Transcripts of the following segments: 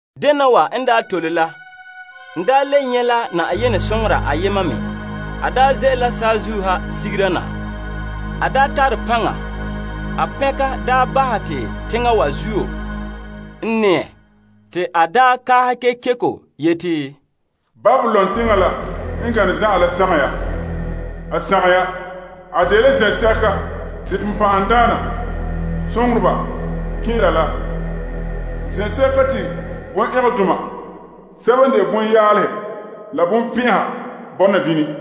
Dena wa n tole la, n le nyɛ' la Yenɛ soŋora ayema me. A ze'ele la saazuo ha sigera na tara paŋa. A soŋa bahɛ te teŋa wa zuo n nɛɛ. Te a kaahɛ kekeko yeti, Babilon teŋa la n gane zan'an la sagom ya! A sagom ya! A dela zen'sɛka te bonbɛ'ɛhe kɛn'ɛra la zen'sɛka te bonɛngɛdoma sɛba n de bonyaalehe la bonfɛn'ɛha bɔna bini.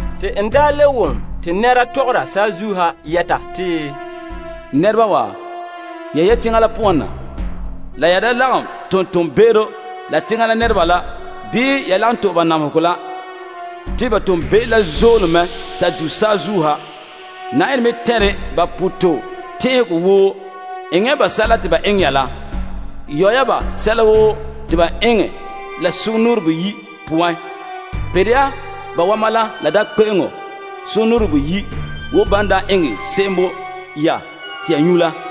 Te n le wom konkore tɔgɔre saazuo ha yeti, N nɛreba wa, yehe teŋa la poan na, la ya da lagom tom toonbe'ero la teŋa nɛreba la bii ya lagom to'e ba namehegɔ la. Te ba toonbe'ero la zoole mɛ ta du saazuo ha. Yenɛ me tɛnre ba pototɛn'ɛhegɔ woo. Enŋa ya ba sɛla te ba eŋɛ ya la. Yɔ ya ba sɛla woo te ba eŋɛ la sugumnɔɔren boyi' poan. Pere ya ba wama la la daam kpe'eŋo sugumnɔɔren boyi' wo ban daa eŋɛ se'em bo ya te ya nyu' la.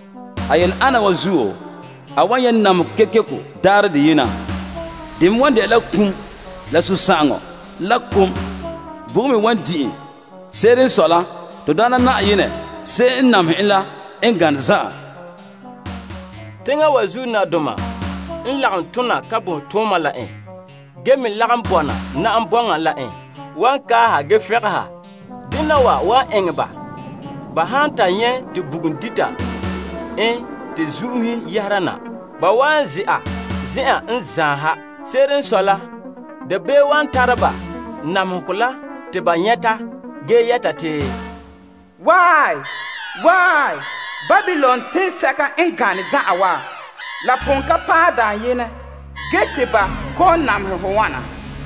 A yele ana wa zuo, a wan nyɛ' namehegɔ kekeko daarɛ deyena. De me wan de'a la kum, la sunsagaŋɔ, la kom. Bugum me wan di' en. Se'ere n sɔe la Na'ayenɛ to Yenɛ, se'em n namehɛ en la n gane zan'an. Teŋa wa zuo nadoma sɛba n lagom yaale la en ge me lagom bɔna na'am bɔŋa la en, wan kaaha ge fɛngɛnha. Dena wa wan eŋɛ ba, ba han ta nyɛ' te bugum dita en te zun'uhe yɛhera na. Ba wan ze'a zen'en n zaan ha. Se'ere n sɔe la, dabeem wan tara ba namehegɔ la te ba nyɛta ge yɛta te, Wae! Wae! Babilon teŋsɛka n gane zan'an wa, la pon ka paɛ dayenɛ ge te ba kɔ'ɔn namehɛ hɔ wana.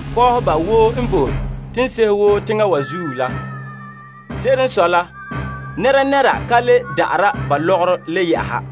Kɔɔheba woo n bo teŋsehe wo teŋa wa zuo la wan kɛla a zuo. Se'ere n sɔe la, nɛnɛra ka le da'ara ba lɔgɔrɔ la yɛ'ɛha: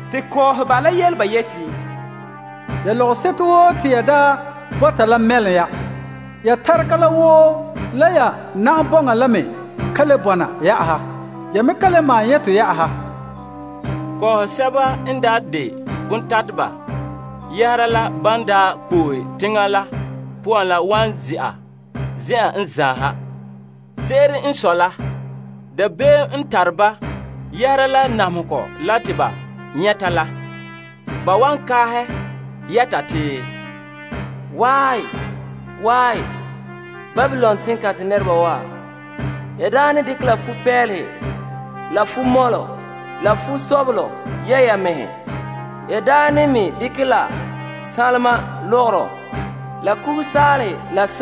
Te kɔɔheba la yele ba yeti, Ya lɔgɔseto woo te ya daa bɔta la mɛlom ya. Ya tarega la woo la ya na'am bɔŋa la me ka le bɔna yɛ'ɛha. Ya me kan le maan nyɛ' tɔ yɛ'ɛha. Kɔɔhɔ sɛba n daa de bontateba yɛhera la ban daa koohe teŋa la poan la wan ze'a zen'an n zaan ha. Se'ere n sɔe la, dabeem n tare ba yɛhera la namehegɔ la te ba nyɛta la. Ba wan kaahɛ yɛta te, Wae! Wae! Babilon teŋkantɛ nɛreba wa. Ya daa ne dekɛ la fupeelehe la fumɔlɔ la fumɔlɔ mɛŋka yɛ' ya mɛhe. Ya daa ne me dekɛ la sanlema la sanlenkuga la kugasaalehe la.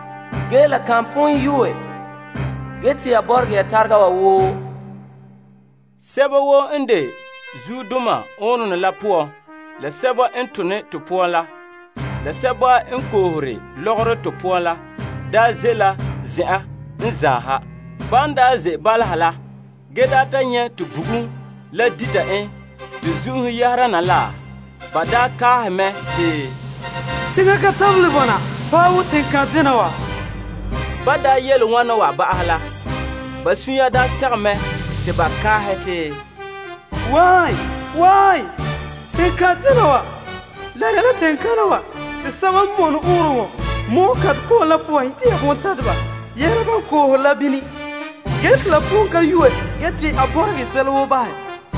Ge la kan pon yue gee te ya bɔregɛ ya tarega wa woo. Sɛba woo n de zuodoma ɔɔnrɔnɔ la poan la sɛba n tone to to poan la, la sɛba n koohore lɔgɔrɔ to poan la daa ze' la zen'an n zaan ha. Ban daa ze' bala ha la nyɛ' te bugum la dite en te zun'uhe yɛhera na la, ge ba kaahɛ mɛ te, Teŋa ka tabelɛ bɔna paɛ wo teŋkantɛ dena wa. Ba yele wana ba'ahɛ la, ba vaɛ la tentɔnɔ yɛɛla ba mɛhe ge kaaha yeti, Wae! Wae! Teŋkantɛ dena wa. La dela teŋkana wa te sɛba n mɔne ɔɔnrɔnɔ ko'kantɛ ko'om la poan dɛna bontateba yɛhera ban koohe la bini. Ge te la pon ka yue ge te a bɔregɛ sɛla woo bahɛ.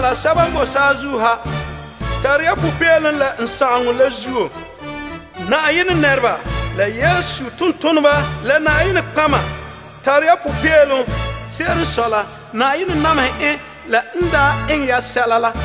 Sɛba n boe saazuo ha, tare ya popeelom la a sagaŋɔ la. Yenɛ nɛreba, la Yesu tontoneba, la nɔtɔgɔheba, tara ya popeelom. Se'ere n sɔe la, Yenɛ namehɛ en la n daa eŋɛ ya se'em la.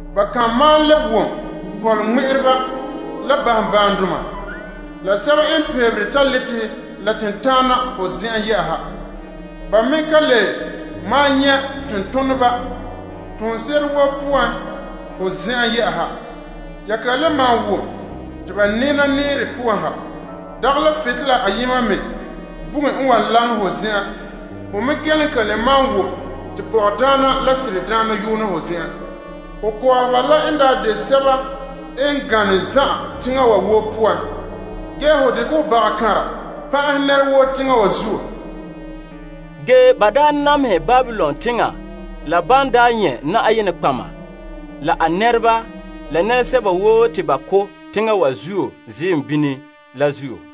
Ba kan malom le wom kɔnlɔgɔ ŋmɛ'ɛreba la baambaandoma, la sɛba n peebere taletehe la tentana ho zen'en yɛ'ɛha. Ba me ka le malom nyɛ' tontoneba toonse'ere woo poan ho zen'en yɛ'ɛha. Ya ka le malom wom te ba nɛɛna nɛɛre poan ha. Dagɛ la butolela la ayema me bugum n wan laŋɛ ho zen'en. Ho me kelom kan le malom wom te pɔgɔdaana la seradaana yoona ho zen'en. Ho kɔɔheba la n daa de sɛba n gane zan'an teŋa wa woo poan. Ge ho dekɛ ho tiim yooro tooma la pan'ahɛ nɛra woo teŋa wa zuo. Ba namehɛ Babilon teŋa wa la ban daa nyɛ' nɔtɔgɔheba, la a nɛreba, la nɛresɛba woo te ba ko' teŋa wa zuo ziim bini la zuo.